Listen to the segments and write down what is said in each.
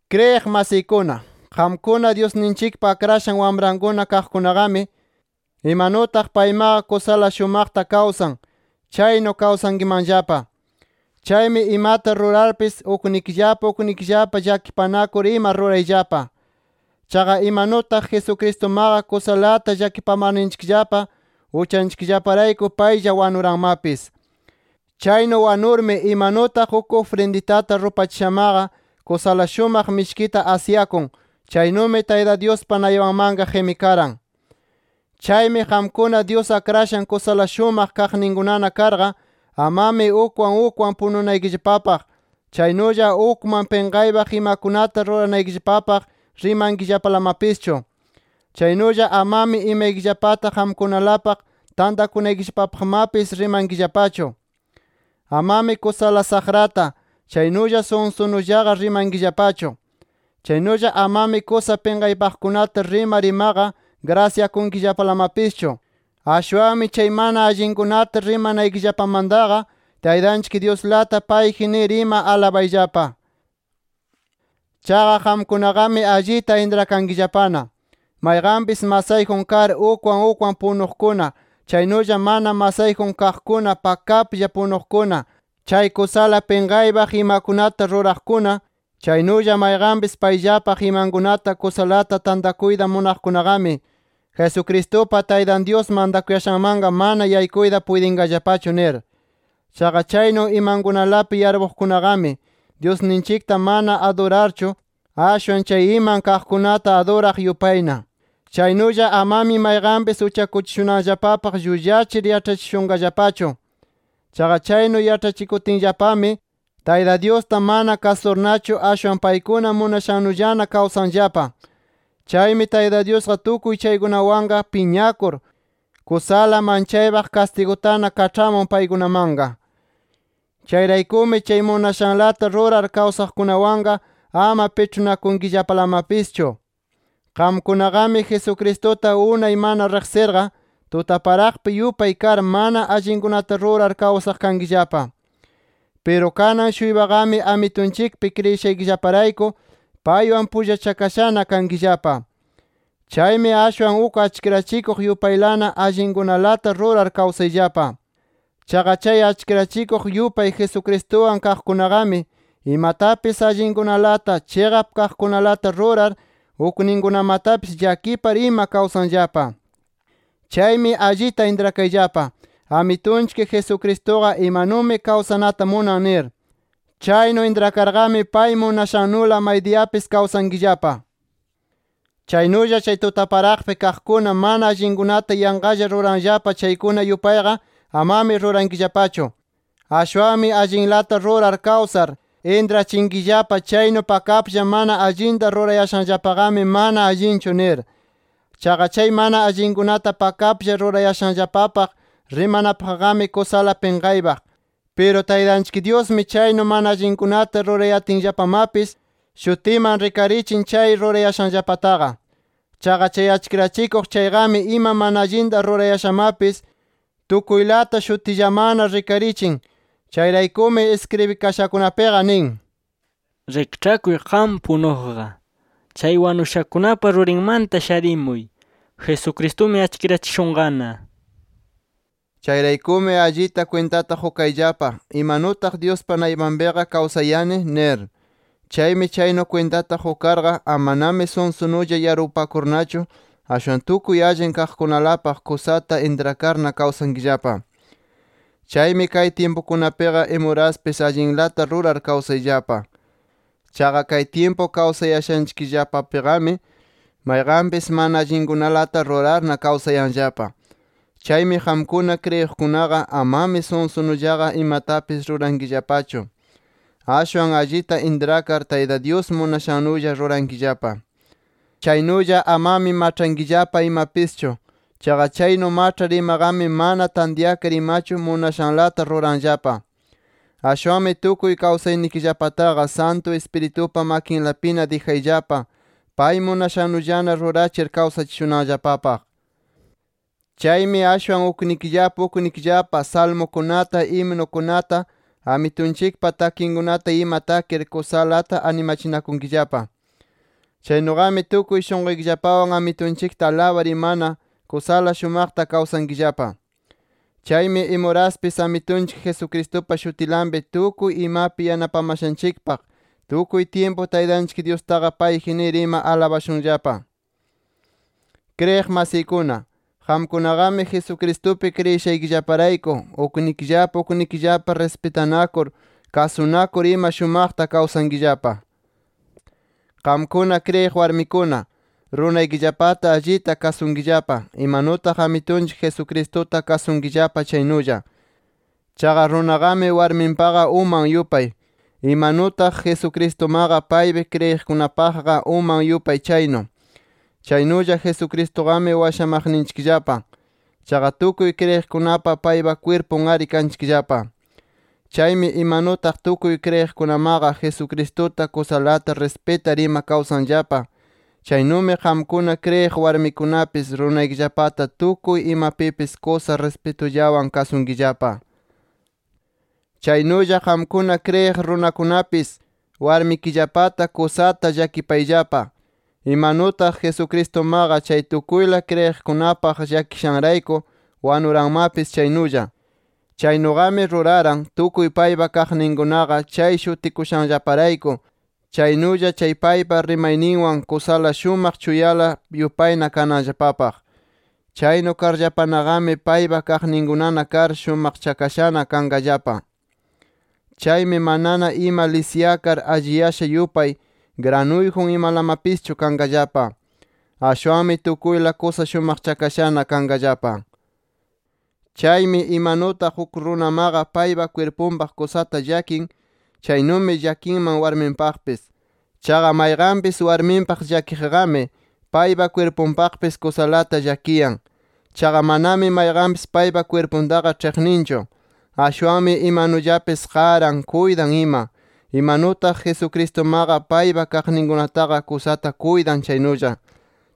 Kriyiq masiykuna, qamkuna Dyusninchikpa akrashan wamrankuna kaqkunaqami, imanutaq paymaqa kusala shumaqta kawsan, chaynu kawsankimanllapa. Chaymi imata rurarpis uknikillapa uknikillapa llakipanakur ima rurayllapa. Chaqa imanutaq Jesucristumaqa kusalata llakipamarninchikllapa uchanchikllaparayku paylla wanuranmapis. Chaynu wanurmi, imanutaq uk ufrinditata rupachishamaqa kusala shumaq mishkita asyakun, chaynumi Tayta Dyuspa naypanmanqa qimikaran. Chaymi qamkuna, Dyus akrashan kusala shumaq kaqninkunana karqa, amami ukwan ukwan pununaykillapapaq, chaynulla ukman pinqaypaq imakunata ruranaykillapapaq rimankillapalamapischu. Chaynulla amami imaykillapata qamkunalapaq tantakunaykillapapaqmapis rimankillapachu. Amami kusala saqrata, chaynulla sunsunullaqa rimankillapachu. Chaynulla amami kusa pinqaypaqkunata rimar imaqa grasyakunkillapalamapischu. Ashwanmi chay mana allinkunata rimanaykillapamantaqa, Taytanchik Dyuslata payji nir ima alabayllapa. Chaqa qamkunaqami allita intrakankillapana, mayqanpis masayjun kar ukwan ukwan punuqkuna, chaynulla mana masayjun kaqkuna pakaplla punuqkuna, chay kusala pinqaypaq imakunata ruraqkuna, chaynulla mayqanpis payllapaq imankunata kusalata tantakuyta munaqkunaqami, Jesucristupa Taytan Dyus mantakuyashanmanqa, mana yaykuyta puytinqallapachu nir. Chaqa chaynu imankunalapi yarpuqkunaqami, Dyusninchikta mana adurarchu, ashwan chay iman kaqkunata aduraq yupayna. Chaynulla amami mayqanpis uchakuchishunanllapapaq llullachir yaĉhachishunqallapachu. Chaqa chaynu yaĉhachikutinllapami, Tayta Dyusta mana kasurnachu, ashwan paykuna munashannullana kawsanllapa. Chaymi Tayta Dyusqa tukuy chaykunawanqa piñakur, kusala manchaypaq kastigutana kaĉhamun paykunamanqa. Chayraykumi chay munashanlata rurar kawsaqkunawanqa ama piĉhunakunkillapalamapischu. Qamkunaqami, Jesucristuta unay mana riqsirqa, tutaparaqpi yupay kar mana allinkunata rurar kawsaq kankillapa. Piru kanan-shuypaqami Amitunchikpi kriyishaykillaparayku, paywan pullachakashana kankillapa. Chaymi ashwan uk achkirachikuq yupaylana, allinkunalata rurar kawsayllapa. Chaqa chay achkirachikuq yupay Jesucristuwan kaqkunaqami, imatapis allinkunalata, chiqap kaqkunalata rurar, ukninkunamatapis llakipar ima kawsanllapa. Chaymi allita intrakayllapa Amitunchik Jesucristuqa imanumi kawsanata munan nir. Chaynu intrakarqami, pay munashannula maydiyapis kawsankillapa. Chaynulla chay tutaparaqpi kaqkuna mana allinkunata yanqalla ruranllapa chaykuna yupayqa amami rurankillapachu. Ashwanmi allinlata rurar kawsar, intrachinkillapa chaynu pakaplla mana allinta rurayashanllapaqami, mana allinchu nir. Chaqa chay mana allinkunata pakaplla rurayashanllapapaq rimanapaqqami kusala pinqaypaq. Piru Taytanchik Dyusmi, chaynu mana allinkunata rurayatinllapamapis, shutiman rikarichin chay rurayashanllapataqa. Chaqa chay achkirachikuq chayqami ima mana allinta rurayashamapis, tukuylata shutillamanna rikarichin. Chayraykumi iskribikashakunapiqa nin: “Rikĉhakuy qam punuqqa. Chay wanushakunapa rurinmanta sharimuy, Jesucristumi achkirachishunqana” nir. Chayraykumi, allita kwintata qukayllapa, ¿imanutaq Dyuspa naypanpiqa kawsayani? nir. Chaymi chaynu kwintata qukarqa, amanami sunsunulla yarpupakurnachu, ashwan tukuy allin kaqkunalapaq kusata intrakarna kawsankillapa. Chaymi kay tyimpukunapiqa imuraspis allinlata rurar kawsayllapa. Chaqa kay tyimpu kawsayashanchikllapapiqami, mayqanpis mana allinkunalata rurarna kawsayanllapa. Chaymi qamkuna kriyiqkunaqa amami sunsunullaqa imatapis rurankillapachu. Ashwan allita intrakar, Tayta Dyus munashannulla rurankillapa. Chaynulla amami maĉhankillapa imapischu. Chaqa chaynu maĉhar imaqami, mana tantyakar imachu, munashanlata ruranllapa. Ashwanmi tukuy kawsaynikillapataqa, Santu Ispiritupa makinlapina dijayllapa pay munashannullana rurachir kawsachishunanllapapaq. Chaymi ashwan uknikillapa uknikillapa salmukunata, himnukunata, Amitunchikpa takinkunata ima takir kusalata animachinakunkillapa. Chaynuqami tukuy shunquykillapawan Amitunchikta alabar imana kusala shumaqta kawsankillapa. Chaymi imuraspis Amitunchik Jesucristupa shutinlapi, tukuy imapi yanapamashanchikpaq tukuy tyimpu Taytanchik Dyustaqa payji nir ima alabashunllapa. Kriyiq masiykuna, qamkunaqami Jesucristupi kriyishaykillaparayku, uknikillapa uknikillapa rispitanakur, kasunakur ima shumaqta kawsankillapa. Qamkuna kriyiq warmikuna, runaykillapata allita kasunkillapa, imanutaq Amitunchik Jesucristuta kasunkillapa chaynulla. Chaqa runaqami, warminpaqa uman yupay. Imanutaq Jesucristumaqa paypi kriyiqkunapaqqa uman yupay chaynu. Chaynulla Jesucristuqami washamaqninchikllapa. Chaqa tukuy kriyiqkunaqa paypa kwirpun-ari kanchikllapa. Chaymi imanutaq, tukuy kriyiqkunamaqa Jesucristuta kusalata rispitar ima kawsanllapa, chaynumi qamkuna kriyiq warmikunapis runaykillapataqa tukuy imapipis kusa rispitullawan kasunkillapa. Chaynulla qamkuna kriyiq runakunapis, warmikillapata kusata llakipayllapa, imanutaq Jesucristumaqa, chay tukuyla kriyiqkunapaq llakishanrayku, wanuranmapis chaynulla. Chaynuqami ruraran, tukuy paypa kaqninkunaqa chay shutikushanllaparayku, chaynulla chay paypa rimayninwan kusala shumaq chuyala yupayna kananllapapaq. Chaynu karllapanaqami paypa kaqninkunana kar, shumaqchakashana kanqallapa. Chaymi manana ima lisyakar alliyasha yupay, granuyjun imalamapischu kanqallapa. Ashwanmi tukuyla kusa shumaqchakashana kanqallapa. Chaymi imanutaq uk runamaqa paypa kwirpunpaq kusata llakin, chaynumi llakinman warminpaqpis. Chaqa mayqanpis warminpaq llakiqqami, paypa kwirpunpaqpis kusalata llakiyan. Chaqa manami mayqanpis paypa kwirpuntaqa ĉhiqninchu. Ashwanmi imanullapis qaran, kuytan ima, imanutaq Jesucristumaqa paypa kaqninkunataqa kusata kuytan chaynulla.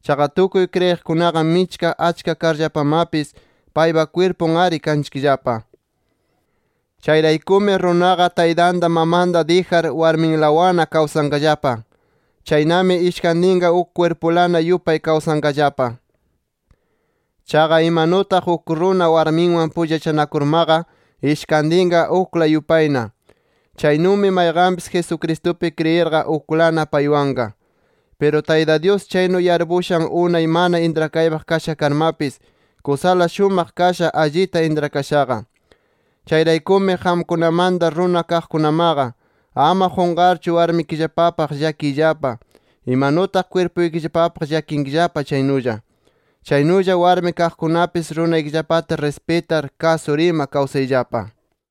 Chaqa tukuy kriyiqkunaqa michka achka karllapamapis paypa kwirpun-ari kanchikllapa. Chayraykumi, runaqa taytanta mamanta dijar warminlawanna kawsanqallapa. Chaynami ishkantinqa uk kwirpulana yupay kawsanqallapa. Chaqa imanutaq uk runa warminwan pullachanakurmaqa ishkantinqa ukla yupayna, chaynumi mayqanpis Jesucristupi kriyirqa uklana paywanqa. Piru Tayta Dyus chaynu yarpushan unay mana intrakaypaq kasha karmapis, kusala shumaq kasha, allita intrakashaqa. Chayraykumi qamkunamanta runa kaqkunamaqa, ama qunqarchu warmikillapapaq llakiyllapa, imanutaq kwirpuykillapapaq llakinkillapa chaynulla. Chaynulla warmi kaqkunapis runaykillapata rispitar, kasur ima kawsayllapa.